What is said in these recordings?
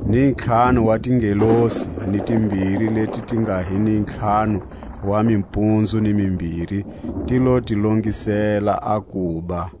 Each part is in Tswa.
Ni ntlhanu wa tingelosi ni timbiri leti ti nga hi ni ntlhanu wa mimpunzu ni mimbiri ti lo ti longisela a kuba.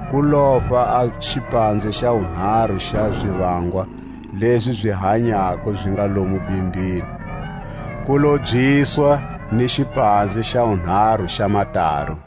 Ku lofa a xipanze xa wunharu xa zivangwa lezi zi hanyako zi nga lomu bimbini; ku lobyiswa ni xipanze xa wunharu xa mataru.